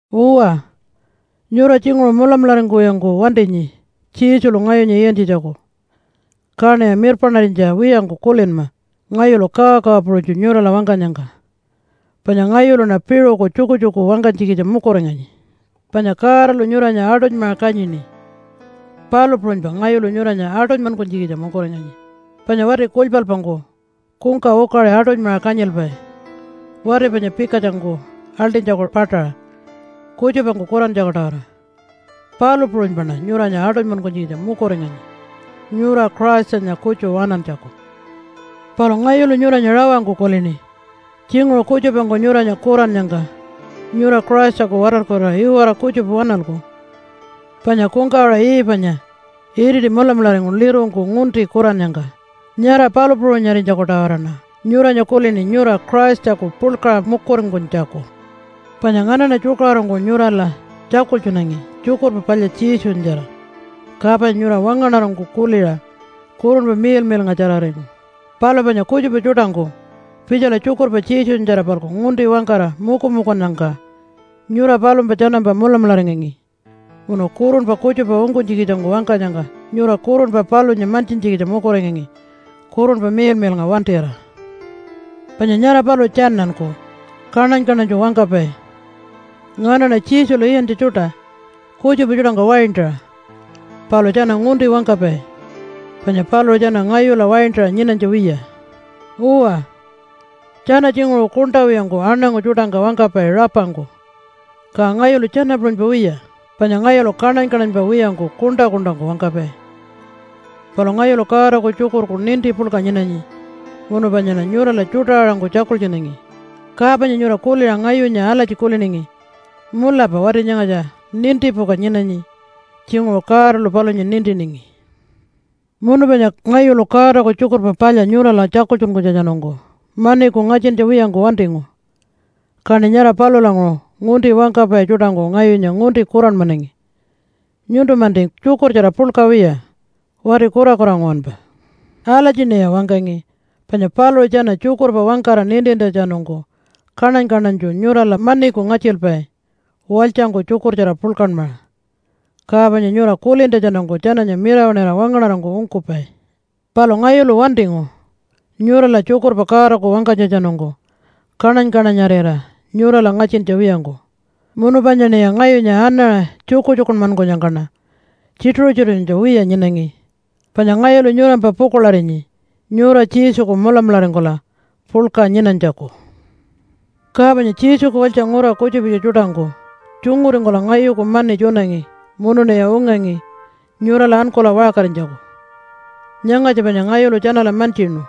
Uwa, nyura tjinguṟu mulamularingkuwiyangku wantinyi Jesulu ngayunya iyantjitjaku, kaṉiya mirpaṉarinytja wiyangku kulinma ngayulu kawakawa puṟunytju nyurala wangkanyangka, panya ngayuluṉa piṟuku tjukutjuku wangkanytjikitja mukuringanyi. Panya Godalu nyuranya aṯunymaṟa kanyini, palu puṟunypa ngayulu nyuranya aṯunymankunytjikitja mukuringanyi, panya wati kulypalpangku kungka ukaṟi aṯunymaṟa kanyilpai wati panya pikatjangku aḻṯinytjaku paṯaṟa kutjupangku kurantjaku-tawara, palu puṟunypaṉa nyuranya aṯunymankunytjikitja mukuringanyi nyura Christanya kutju waṉantjaku. Palu ngayulu nyuranya rawangku kulini tjinguṟu kutjupangku nyuranya kurannyangka nyura Christaku watarkurira iwara kutjupa waṉalku, panya kungkawaṟa Eve-anya iriti mulamularingu lirungku ngunti kurannyangka, nyara palu puṟunyarinytjaku-tawaraṉa nyuranya kulini nyura Christaku puḻkaṟa mukuringkunytjaku. Panya nganaṉa tjukaṟurungku nyurala tjakultjunangi Tjukurpa Palya Jesunyatjara, ka panya nyura wangaṉarangku kuliṟa Kurunpa Miḻmiḻngatjararingu. Palu panya kutjupa tjuṯangku pitjala tjukurpa Jesunyatjara-palku ngunti wangkara mukumukunnyangka nyura palumpa tjanampa mulamularingangi, munu kurunpa kutjupa ungkunytjikitjangku wangkanyangka nyura kurunpa palunya mantjintjikitja mukuringangi Kurunpa Miḻmiḻnga wantira. Panya nyara paluṟu tjananku kaṉany-kaṉanytju wangkapai, “Nganaṉa Jesulu iyantja tjuṯa, kutjupa tjuṯangka waintaṟa.” Palu tjana ngunti wangkapai, panya paluṟu tjana ngayula waintaṟa nyinanytja wiya. Uwa, tjana tjinguṟu kuṉṯa wiyangku aṉangu tjuṯangka wangkapai rapangku, ka ngayulu tjana puṟunypa wiya panya ngayulu kaṉany-kaṉanypa wiyangku kuṉṯa-kuṉṯangku wangkapai. Palu ngayulu Godaku tjukurku ninti puḻka nyinanyi, munu panyaṉa nyurala tjuṯa-aṟangku tjakultjunangi, ka panya nyura kuliṟa ngayunya alatji kuliningi, “Mulapa wati nyangatja nintipuka nyinanyi. Tjinguṟu Godalu palunya nintiningi.” Munu panya ngayulu Godaku Tjukurpa Palya nyurala tjakultjunkunytjatjanungku maniku ngatjintja wiyangku wantingu, kaṉi nyara palulanguṟu ngunti wangkapai tjuṯangku ngayunya ngunti kuranmanangi, “Nyuntu-manti tjukurtjara puḻka wiya, wati kurakura nguwanpa.” Alatjiṉiya wangkangi, panya paluṟu tjana tjukurpa wangkara nintintjatjanungku kaṉany-kaṉanytju nyurala maniku ngatjilpai walytjangku tjukurtjara puḻkanmaṟa, ka panya nyura kulintjatjanungku tjananya mirawaṉira wangaṉarangku ungkupai. Palu ngayulu wantingu nyurala tjukurpa Godaku wangkanytjatjanungku kaṉany-kaṉanyarira nyurala ngatjintja wiyangku. Munu panyaṉiya ngayunya anaṟa tjukutjukunmankunyangkaṉa tjituṟu-tjituṟurinytja wiya nyinangi, panya ngayulu nyurampa pukuḻarinyi nyura Jesuku mulamularingkula puḻka nyinanytjaku. Ka panya Jesuku walytja ngura kutjupitja tjuṯangku tjunguringkula ngayuku mani tjunangi munuṉiya ungangi nyurala ankula waṟkarinytjaku. Nyangatja panya ngayulu tjanala mantjinu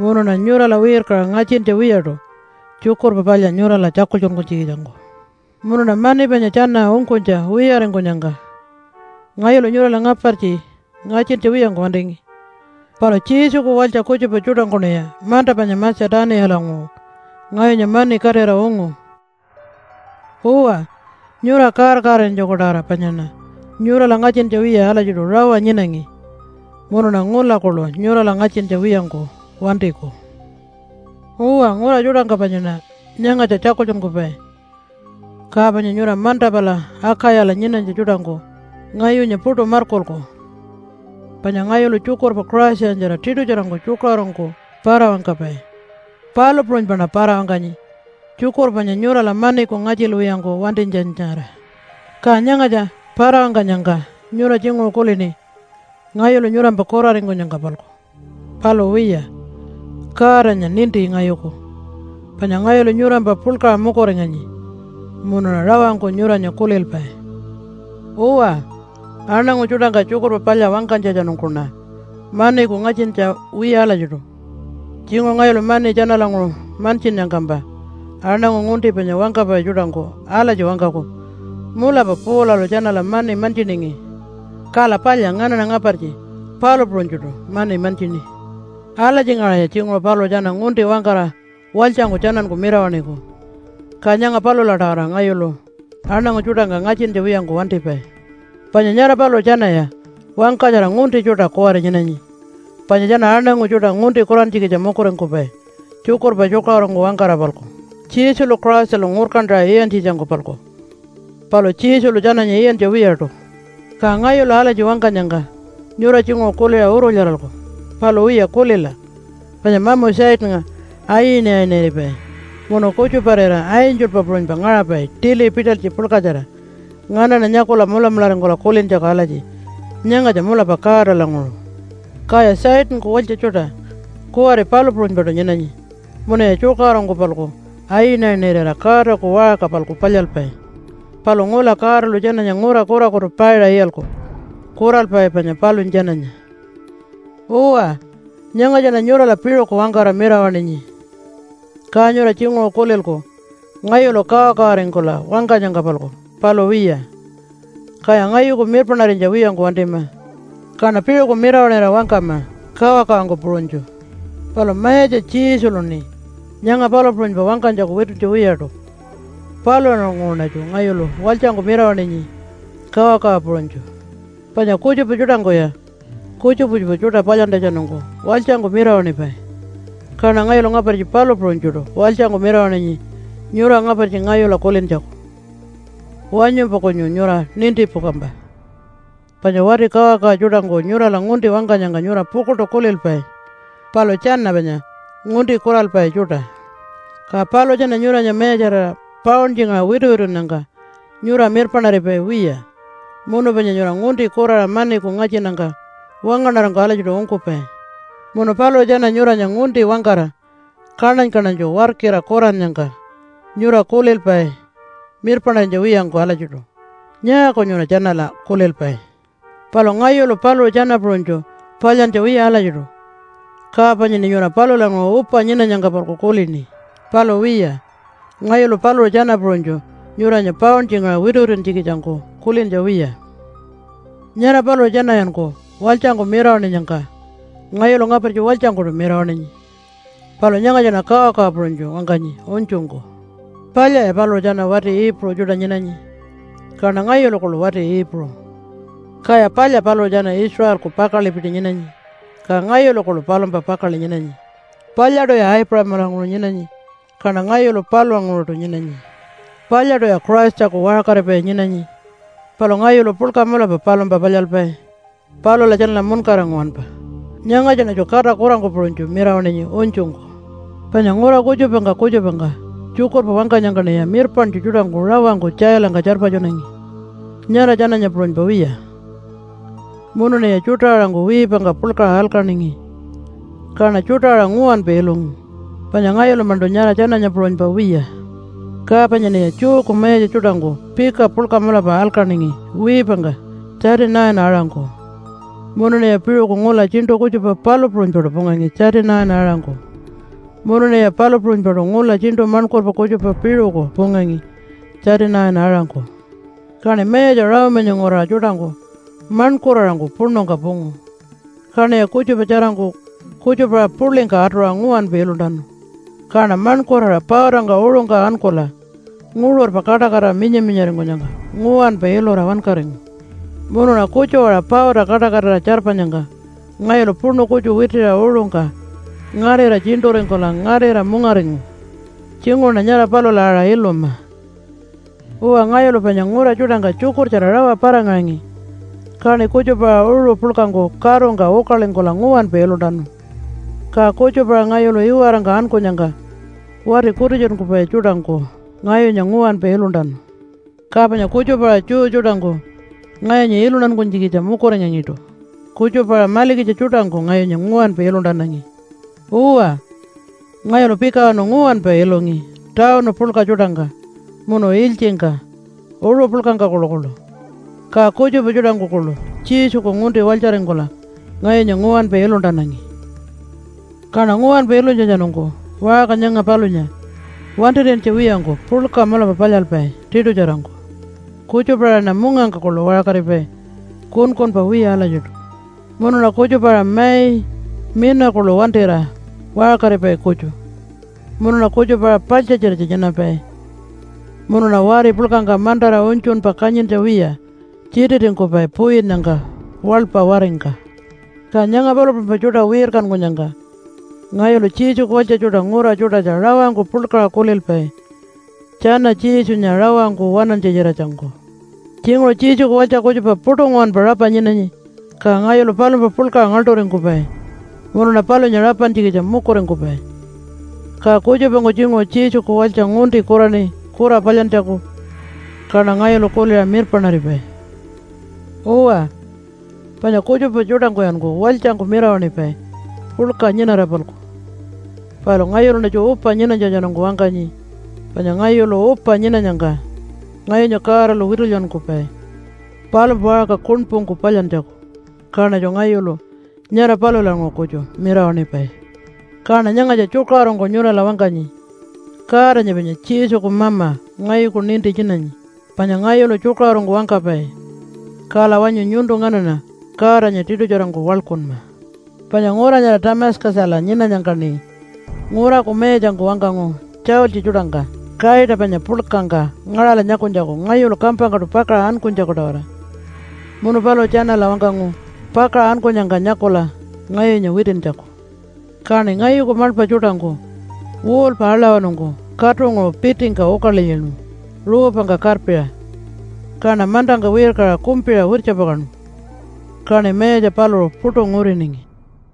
munuṉa nyurala wirkaṟa ngatjintja wiyaṯu Tjukurpa Palya nyurala tjakultjunkunytjikitjangku. Munuṉa mani panya tjana ungkunytja wiyaringkunyangka ngayulu nyurala ngapartji ngatjintja wiyangku wantingi. Palu Jesuku walytja kutjupa tjuṯangkuṉiya manta panya Matja-tuniyalanguṟu ngayunya mani katira ungu. Uwa, nyura kaar-kaararinytjaku-tawara panyaṉa nyurala ngatjintja wiya alatjiṯu rawa nyinangi, munuṉa ngula kuḻu nyurala ngatjintja wiyangku wantiku. Uwa, ngura tjuṯangka panyaṉa nyangatja tjakultjunkupai, ka panya nyura manta pala Akayala nyinanytja tjuṯangku ngayunya puṯu markulku. Panya ngayulu tjukurpa Christanyatjara tiṯutjarangku tjukaṟurungku para-wangkapai, palu puṟunypaṉa para-wangkanyi tjukurpa panya nyurala maniku ngatjilwiyangku wantinytjanyatjara. Ka nyangatja para-wangkanyangka nyura tjinguṟu kulini ngayulu nyurampa kuraringkunyangka-palku. Palu wiya, Godanya ninti ngayuku, panya ngayulu nyurampa puḻkaṟa mukuringanyi munuṉa rawangku nyuranya kulilpai. Uwa, aṉangu tjuṯangka Tjukurpa Palya wangkanytjatjanungkuṉa maniku ngatjintja wiya alatjiṯu. Tjinguṟu ngayulu mani tjanalanguṟu mantjinnyangkampa aṉangu ngunti panya wangkapai tjuṯangku alatji wangkaku, “Mulapa Paulalu tjanala mani mantjiningi. Kala palya nganaṉa ngapartji palu puṟunytjuṯu mani mantjini.” Alatjingaṟaya tjinguṟu paluṟu tjana ngunti wangkara walytjangku tjananku mirawaṉiku, ka nyanga palula-tawara ngayulu aṉangu tjuṯangka ngatjintja wiyangku wantipai. Panya nyara paluṟu tjanaya wangkatjara ngunti tjuṯa kuwari nyinanyi, panya tjana aṉangu tjuṯa ngunti kurantjikitja mukuringkupai tjukurpa tjukaṟurungku wangkara-palku Jesulu Christalu ngurkantaṟa iyantjitjangku-palku. Palu Jesulu tjananya iyantja wiyaṯu. Ka ngayulu alatji wangkanyangka nyura tjinguṟu kuliṟa urulyaralku. Palu wiya, kulila! Panya mamu Satannga ayinayiniripai munu kutjuparira angelpa puṟunypa ngaṟapai tili pitalytji puḻkatjara nganaṉa nyakula mulamularingkula kulintjaku alatji, “Nyangatja mulapa Godalanguṟu.” Kaya Satanku walytja tjuṯa kuwari palu puṟunypaṯu nyinanyi munuya tjukaṟurungku-palku ayinayinirira Godaku waṟka-palku palyalpai. Palu ngula Godalu tjananya ngura kurakutu paiṟa iyalku kuralpai panya palunya tjananya. Uwa, nyangatjaṉa nyurala piṟuku wangkara mirawaṉinyi. Ka nyura tjinguṟu kulilku ngayulu kawakawaringkula wangkanyangka-palku, palu wiya. Kaya ngayuku mirpaṉarinytja wiyangku wantima, kaṉa piṟuku mirawaṉira wangkama kawakawangku puṟunytju. Palu Mayatja Jesuluṉi nyanga palu puṟunypa wangkanytjaku wituntja wiyaṯu. Palulanguṟuṉatju ngayulu walytjangku mirawaṉinyi kawakawa puṟunytju. Panya kutjupa tjuṯangkuya kutjupa kutjupa tjuṯa palyantjatjanungku walytjangku mirawaṉipai, kaṉa ngayulu ngapartji palu puṟunytjuṯu walytjangku mirawaṉinyi nyura ngapartji ngayula kulintjaku. Wanyumpa kunyu nyura nintipukampa! Panya wati kawakawa tjuṯangku nyurala ngunti wangkanyangka nyura pukuḻṯu kulilpai, palu tjana panya ngunti kuralpai tjuṯa. Ka paluṟu tjana nyuranya mayatjarira pauntjingaṟa wituwitunnyangka nyura mirpaṉaripai wiya, munu panya nyura ngunti kuraṟa maniku ngatjinnyangka wangaṉarangku alatjiṯu ungkupai. Munu paluṟu tjana nyuranya ngunti wangkara kaṉany-kaṉanytju warkira kurannyangka nyura kulilpai mirpaṉarinytja wiyangku alatjiṯu. Nyaaku nyura tjanala kulilpai? Palu ngayulu paluṟu tjana puṟunytju palyantja wiya alatjiṯu, ka panyaṉi nyura palulanguṟu upa nyinanyangka-palku kulini. Palu wiya, ngayulu paluṟu tjana puṟunytju nyuranya pauntjingaṟa wituwituntjikitjangku kulintja wiya. Nyara paluṟu tjanayanku walytjangku mirawaṉinyangka ngayulu ngapartji walytjangkuṯu mirawaṉinyi. Palu nyangatjaṉa kawakawa puṟunytju wangkanyi unytjungku. Palyaya paluṟu tjana wati Iipuṟu tjuṯa nyinanyi, kaṉa ngayulu kuḻu wati Iipuṟu. Kaya palya paluṟu tjana Israelku pakaḻipiti nyinanyi, ka ngayulu kuḻu palumpa pakaḻi nyinanyi. Palyaṯuya Aipuṟamalanguṟu nyinanyi, kaṉa ngayulu palulanguṟuṯu nyinanyi. Palyaṯuya Christaku waṟkaripai nyinanyi, palu ngayulu puḻka mulapa palumpa palyalpai palula tjanala muṉkara nguwanpa. (Nyangatjaṉatju kata kurangku puṟunytju mirawaṉinyi unytjungku.) Panya ngura kutjupangka kutjupangka tjukurpa wangkanyangkaṉiya mirpaṉtju tjuṯangku rawangku tjailangka tjarpatjunangi nyara tjananya puṟunypa wiya. Munuṉiya tjuṯa-aṟangku wiipangka puḻkaṟa alkaningi, kaṉa tjuṯa-aṟa nguwanpa ilungu, panya ngayulu-maṉṯu nyara tjananya puṟunypa wiya. Ka panyaṉiya Jewku mayatja tjuṯangku pika puḻka mulapa alkaningi wiipangka 39-aṟangku, munuṉiya piṟuku ngula tjiṉṯu kutjupa palu puṟunypaṯu pungangi 39-aṟangku. Munuṉiya palu puṟunypaṯu ngula tjiṉṯu maṉkurpa kutjupa piṟuku pungangi 39-aṟangku. Kaṉi mayatja Rome-anya nguraṟa tjuṯangku maṉkuraṟangku puṉungka pungu, kaṉiya kutjupa tjarangku kutjupa-aṟa puḻingka atuṟa nguwanpa iluntanu. Kaṉa maṉkuraṟa pautangka uṟungka ankula nguṟurpa kaṯakatira minya-minyaringkunyangka nguwanpa ilura wankaringu. Munuṉa kutju-aṟa pauta kaṯakatira tjarpanyangka ngayulu puṉu kutju witiṟa uṟungka ngarira tjiṉṯuringkula ngarira mungaringu. Tjinguṟuṉa nyara palula aṟa iluma. Uwa, ngayulu panya ngura tjuṯangka tjukurtjara rawa para-ngaṟangi, kaṉi kutjupa-aṟa uṟu puḻkangku karungka ukalingkula nguwanpa iluntanu. Ka kutjupa-aṟa ngayulu iwarangka ankunyangka wati kutitjunkupai tjuṯangku ngayunya nguwanpa iluntanu. Ka panya kutjupa-aṟa Jew tjuṯangku ngayunya iluntankunytjikitja mukuringangiṯu, kutjupa-aṟa malikitja tjuṯangku ngayunya nguwanpa iluntanangi. Uwa, ngayulu pikawanu nguwanpa ilungi tawunu puḻka tjuṯangka, munu ilytjingka, uṟu puḻkangka kuḻukuḻu. Ka kutjupa tjuṯangku kuḻu Jesuku ngunti walytjaringkula ngayunya nguwanpa iluntanangi. Kaṉa nguwanpa ilunytjatjanungku waṟka nyanga palunya wantir'iyantja wiyangku puḻka mulapa palyalpai tiṯutjarangku. Kutjupa-aṟaṉa mungangka kuḻu waṟkaripai kunkunpa wiya alatjiṯu. Munuṉa kutjupa-aṟa mai mina kuḻu wantira waṟkaripai kutju. Munuṉa kutjupa-aṟa paḻtjatjiratja nyinapai, munuṉa wari puḻkangka mantara unytjunpa kanyintja wiya tjititingkupai puyinnyangka waḻpa waringka. Ka nyanga palu puṟunypa tjuṯa wirkankunyangka ngayulu Jesuku walytja tjuṯa ngura tjuṯatja rawangku puḻkaṟa kulilpai tjana Jesunya rawangku waṉantja-tjiratjangku. Tjinguṟu Jesuku walytja kutjupa puṯu nguwanpa rapa nyinanyi, ka ngayulu palumpa puḻkaṟa ngaḻṯuringkupai munuṉa palunya rapantjikitja mukuringkupai. Ka kutjupangku tjinguṟu Jesuku walytja ngunti kuraṉi kura palyantjaku, kaṉa ngayulu kuliṟa mirpaṉaripai. Uwa, panya kutjupa tjuṯangkuyanku walytjangku mirawaṉipai puḻka nyinara-palku, palu ngayuluṉatju upa nyinanytjatjanungku wangkanyi, panya ngayulu upa nyinanyangka ngayunya Godalu witulyankupai palumpa waṟka kuṉpungku palyantjaku, kaṉatju ngayulu nyara palulanguṟu kutju mirawaṉipai. Kaṉa nyangatja tjukaṟurungku nyurala wangkanyi, Godanya panya Jesuku Mama ngayuku ninti nyinanyi, panya ngayulu tjukaṟurungku wangkapai. Kala wanyu nyuntu nganaṉa Godanya tiṯutjarangku waḻkunma. Panya ngura nyara Tamatjakala nyinanyangkaṉi nguraku mayatjangku wangkangu tjaultji tjuṯangka kaita panya puḻkangka ngaṟala nyakunytjaku, ngayulu kampangkaṯu pakaṟa ankunytjaku-tawara. Munu paluṟu tjanala wangkangu pakaṟa ankunyangka nyakula ngayunya witintjaku. Kaṉi ngayuku maḻpa tjuṯangku wall-pa aḻawanungku katunguṟu pitingka ukalilyinu ruupangka karpiṟa, kaṉa mantangka wirkaṟa kumpiṟa wirtjapakaṉu, kaṉi mayatja paluṟu puṯu nguriningi.